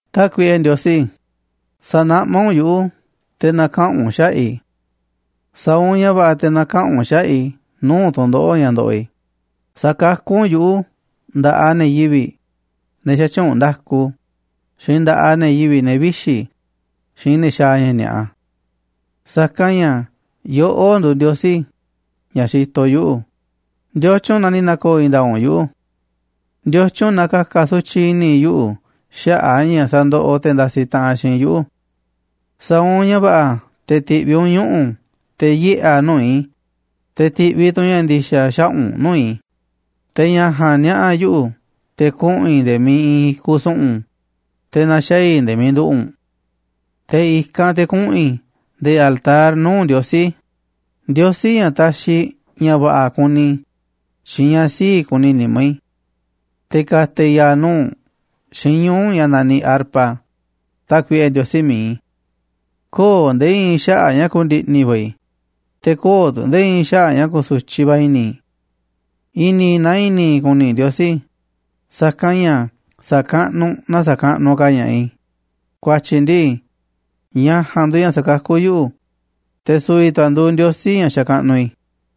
Tákuiꞌe Ndiosí, sa̱naꞌmá u̱nꞌ yuꞌu̱ te̱ na̱kaꞌa̱n u̱nꞌ xaꞌa̱ꞌ i̱. Sa̱a̱ u̱nꞌ ña̱ va̱ꞌa̱ te̱ na̱kaꞌa̱n u̱nꞌ xaꞌa̱ꞌ i̱ nuu̱ꞌ tu̱ndoꞌo̱ꞌ ña̱ ndoꞌoꞌ i̱. Sa̱kakú u̱nꞌ yuꞌu̱ nda̱ꞌaꞌ ne̱ yivi̱ꞌ, ne̱ xätyuunꞌ nda̱ku, xiinꞌ nda̱ꞌaꞌ ne̱ yivi̱ꞌ, ne̱ vixi̱ xiinꞌ ne̱ xaaꞌ ña̱ ni̱a̱ꞌa. Sa̱kanꞌ ña̱ yoꞌó nduuꞌ Ndiosí ña̱ xitoꞌ yuꞌu̱. ¿Ndiotyun na ni̱ na̱ko̱o̱ i̱i̱n nda̱a̱ꞌ u̱nꞌ yuꞌu̱? ¿Ndiotyun na ka̱ka̱ sutyiꞌ i̱ni̱ yuꞌu̱ xaꞌa̱ꞌ a̱ ña̱ sandoꞌoꞌ te̱ ndasiꞌ taꞌanꞌ xiinꞌ yuꞌu̱? Sa̱a̱ u̱nꞌ ña̱ va̱ꞌa̱ te̱ ti̱ꞌviꞌ u̱nꞌ ñuꞌu̱ u̱nꞌ te̱ yiꞌe̱ a̱ nuu̱ꞌ i̱, te̱ ti̱ꞌviꞌ tu̱ u̱nꞌ ña̱ ndi̱xa̱ xaꞌa̱ꞌ u̱nꞌ nuu̱ꞌ i̱, te̱ ña̱ ja̱a̱nꞌ niaꞌa̱ yuꞌu̱ te̱ kuꞌu̱n i̱ nde̱e̱ miiꞌ iinꞌ i̱kuꞌ su̱ꞌu̱n, te̱ na̱xaa̱ i̱ nde̱e̱ miiꞌ nduꞌu̱ꞌ u̱nꞌ. Te̱ i̱kanꞌ te̱ kuꞌu̱n i̱ nde̱e̱ altar nuu̱ꞌ Ndiosí, Ndiosí ña̱ taxiꞌ ña̱ va̱ꞌa̱ kuni i̱ xiinꞌ ña̱ sii̱ꞌ kuni nimá i̱. Te̱ ka̱ta̱ i̱ ya̱a̱ nuu̱ꞌ u̱nꞌ xiinꞌ ñuu̱ꞌ ña̱ naniꞌ arpa, Tákuiꞌe Ndiosí mi̱iꞌ i̱. Köo̱ꞌ nde̱e̱ i̱i̱n xaꞌa̱ꞌ ña̱ ku̱ndi̱ꞌni̱ va̱ i̱, te̱ köo̱ꞌ tu̱ nde̱e̱ i̱i̱n xaꞌa̱ꞌ ña̱ ku̱su̱tyiꞌ va̱ i̱ni̱ i̱. I̱ni̱ na i̱ni̱ i̱ ku̱ni̱ Ndiosí, sa̱kanꞌ ña̱ sa̱kaꞌnuꞌ na sa̱kaꞌnuꞌ ka̱ ña̱ꞌaꞌ i̱, ku̱a̱tyi̱ ndii, ña̱ ja̱a̱nꞌ nduuꞌ ña̱ sakakú yuꞌu̱, te̱ su̱vi̱ tu̱ a̱ nduuꞌ Ndiosí ña̱ xakaꞌnuꞌ i̱.